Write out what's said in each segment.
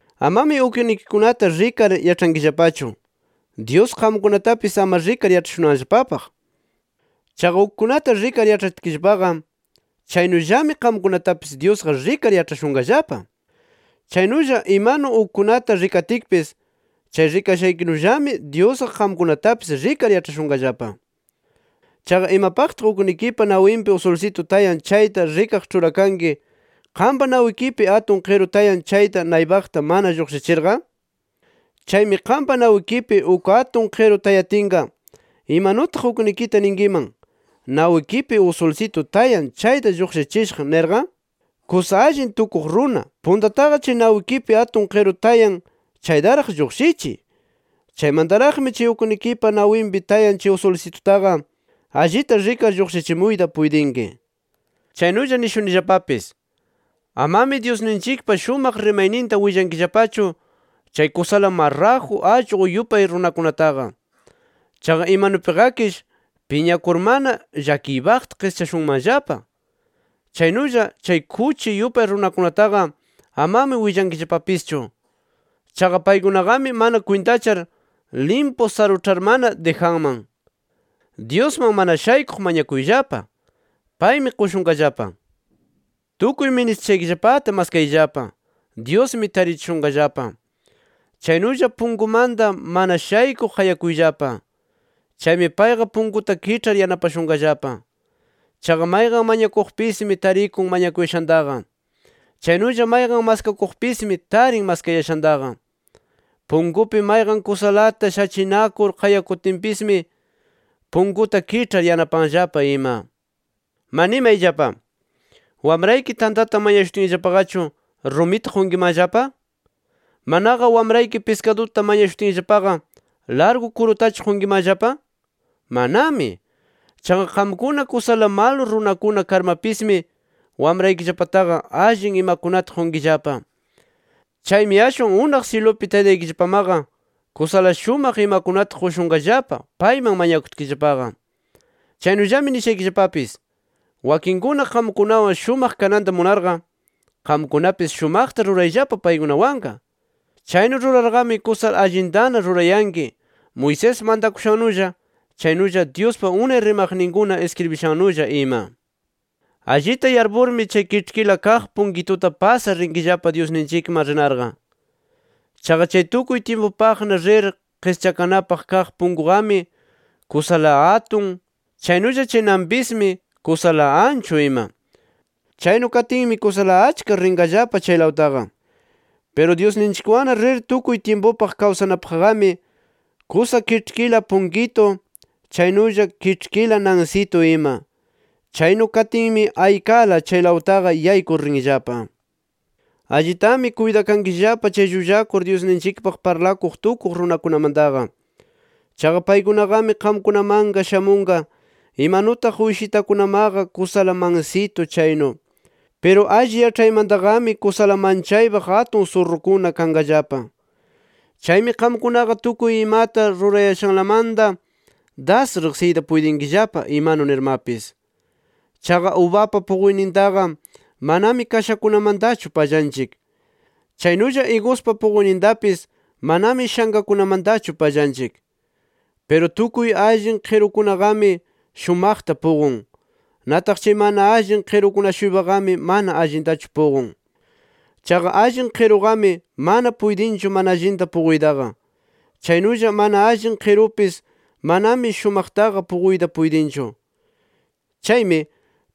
“Amami uknikikunata rikar yaĉhankillapachu, Dyus qamkunatapis ama rikar yaĉhashunanllapapaq. Chaqa ukkunata rikar yaĉhatkillapaqa, chaynullami qamkunatapis Dyusqa rikar yaĉhashunqallapa. Chaynulla imanu ukkunata rikatkipis, chay rikashaykinullami Dyusqa qamkunatapis rikar yaĉhashunqallapa. ¿Chaqa imapaqtaq uknikipa nawinpi usulsitu tayan chayta rikaq ĉhurakanki, qampa nawikipi atun qiru tayan chayta naypaqta mana lluqshichirqa? Chaymi qampa nawikipi uk atun qiru tayatinqa, ¿imanutaq uknikita ninkiman: ‘Nawikipi usulsitu tayan chayta lluqshichishaq’ nirqa? ¡Kusa allin tukuq runa! Puntataqa chay nawikipi atun qiru tayan chaytaraq lluqshichiy. Chaymantaraqmi chay uknikipa nawinpi tayan chay usulsitutaqa allita rikar lluqshichimuyta puytinki. “Chaynulla nishunillapapis: Amami Dyusninchikpa shumaq rimayninta willankillapachu chay kusala marraju allqu yupay runakunataqa. Chaqa imanupiqakish piñakurmana llakiypaqta qischashunmanllapa. Chaynulla chay kuchi yupay runakunataqa amami willankillapapischu. Chaqa paykunaqami mana kwintachar limpu saruĉharmana dijanman. “Dyusman mana shaykuq mañakuyllapa; paymi qushunqallapa. Tukuy ministishaykillapata maskayllapa; Dyusmi tarichishunqallapa. Chaynulla punkumanta mana shaykuq qayakuyllapa. Chaymi payqa punkunta kiĉhar yanapashunqallapa. Chaqa mayqan mañakuqpismi tarikun mañakuyashantaqa. Chaynulla mayqan maskakuqpismi, tarin maskayashantaqa. Punkupi mayqan kusalata shachinakur qayakutinpismi, punkunta kiĉhar yanapanllapa ima. “¡Ma nimayllapa! ¿Wamrayki tantata mañashutinllapaqachu rumita qunkimanllapa? ¿Manaqa wamrayki piskaduta mañashutinllapaqa, largu kurutachu qunkimanllapa? ¡Manami! Chaqa qamkuna kusala malu runakuna karmapismi, wamraykillapataqa allin imakunata qunkillapa. Chaymi ashwan ¡unaq syilupi Taytaykillapamaqa kusala shumaq imakunata qushunqallapa payman mañakutkillapaqa! “Chaynullami nishaykillapapis: Wakinkuna qamkunawan shumaq kananta munarqa, qamkunapis shumaqta rurayllapa paykunawanqa. Chaynu rurarqami kusala allintana rurayanki, Moisés mantakushannulla, chaynulla Dyuspa unay rimaqninkuna iskribishannulla ima. “Allita yarpurmi, chay kiĉhkila kaq punkituta pasar rinkillapa Dyusninchikman rinarqa. Chaqa chay tukuy tyimpupaqna rir qischakanapaq kaq punkuqami kusala atun chaynulla chay nanpismi, kusala anchu ima. Chaynu katinmi kusala achka rinqallapa chaylawtaqa. Piru Dyusninchikwanna rir tukuy tyimpupaq kawsanapaqqami kusa kiĉhkila punkitu, chaynulla kiĉhkila nansitu ima. Chaynu katinmi aykala chaylawtaqa yaykur rinllapa. “Allitami kuytakankillapa chay llullakur Dyusninchikpaq parlakuq tukuq runakunamantaqa. Chaqa paykunaqami qamkunamanqa shamunqa imanutaq uyshitakunamaqa kusala mansitu chaynu. Piru alli yaĉhaymantaqami kusala manchaypaq atun surrukuna kanqallapa. Chaymi qamkunaqa tukuy imata rurayashanlamanta das riqsiyta puytinkillapa imanu nirmapis. Chaqa ubapa puquynintaqa manami kashakunamantachu pallanchik. Chaynulla Iguspa puquynintapis manami shankakunamantachu pallanchik. Piru tukuy allin qirukunaqami shumaqta puqun. Nataq chay mana allin qirukuna-shuypaqami mana allintachu puqun. Chaqa allin qiruqami mana puytinchu mana allinta puquytaqa. Chaynulla mana allin qirupis manami shumaqtaqa puquyta puytinchu. Chaymi,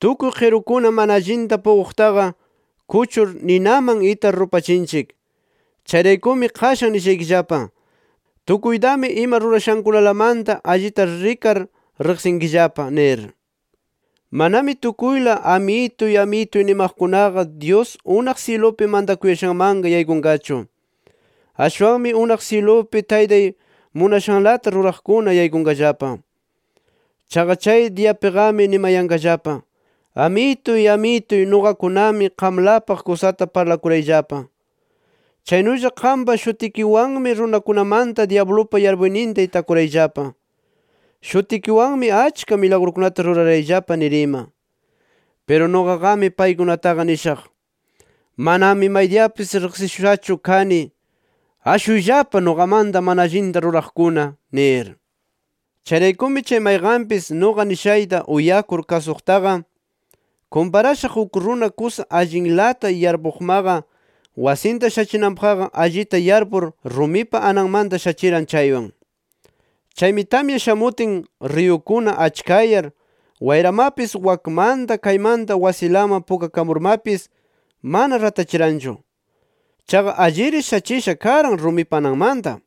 tukuy qirukuna mana allinta puquqtaqa kuchur ninaman itar rupachinchik. Chayraykumi qashan nishaykillapa: Tukuytami ima rurashankunalamanta allita rikar riqsinkillapa nir. “Manami tukuyla ‘Amituy, Amituy’ nimaqkunaqa, Dyus unaq syilupi mantakuyashanmanqa yaykunqachu. Ashwanmi, unaq syilupi Taytay munashanlata ruraqkuna yaykunqallapa. Chaqa chay diyapiqami nimayanqallapa: ‘Amituy, Amituy, nuqakunami qamlapaq kusata parlakurayllapa. Chaynulla qampa shutikiwanmi runakunamanta dyablupa yarpuyninta itakurayllapa. Shutikiwanmi achka milagrukunata rurarayllapa’ nir ima. Piru nuqaqami paykunataqa nishaq: ‘Manami maydiyapis riqsishushachu kani. ¡Ashuyllapa nuqamanta, mana allinta ruraqkuna!’ nir. “Chayraykumi, chay mayqanpis nuqa nishayta uyakur kasuqtaqa kumparashaq uk runa kusa allinlata yarpuqmaqa wasinta shachinanpaqqa allita yarpur, rumipa ananmanta shachiran chaywan. Chaymi tamya shamutin, riyukuna achkayar, wayramapis wakmanta, kaymanta wasilaman pukakamurmapis mana ratachiranchu. Chaqa alliri shachisha karan rumipa ananmanta.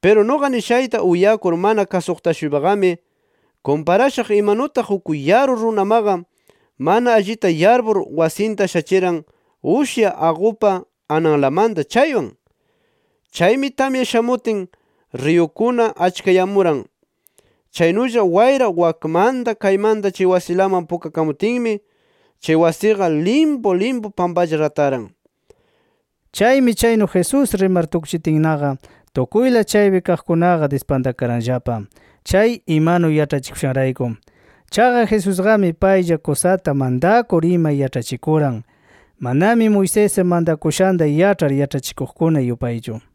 Piru nuqa nishayta uyakur mana kasuqta-shuypaqami kumparashaq imanutaq uk yaru runamaqa mana allita yarpur wasinta shachiran ushya aqupa ananlamanta chaywan. Chaymi tamya shamutin, riyukuna achkayamuran. Chaynulla wayra wakmanta kaymanta chay wasiman pukakamutinmi chay wasiqa limpu limpu pampalla rataran”. Chaymi chaynu Jesús rimar tukchitinnaqa, tukuyla chaypi kaqkunaqa dispantakaranllapa chay imanu yaĉhachikushanrayku. Chaqa Jesusqami paylla kusata mantakur ima yaĉhachikuran, manami Moisés mantakushanta yaĉhar yaĉhachikuqkuna yupaychu.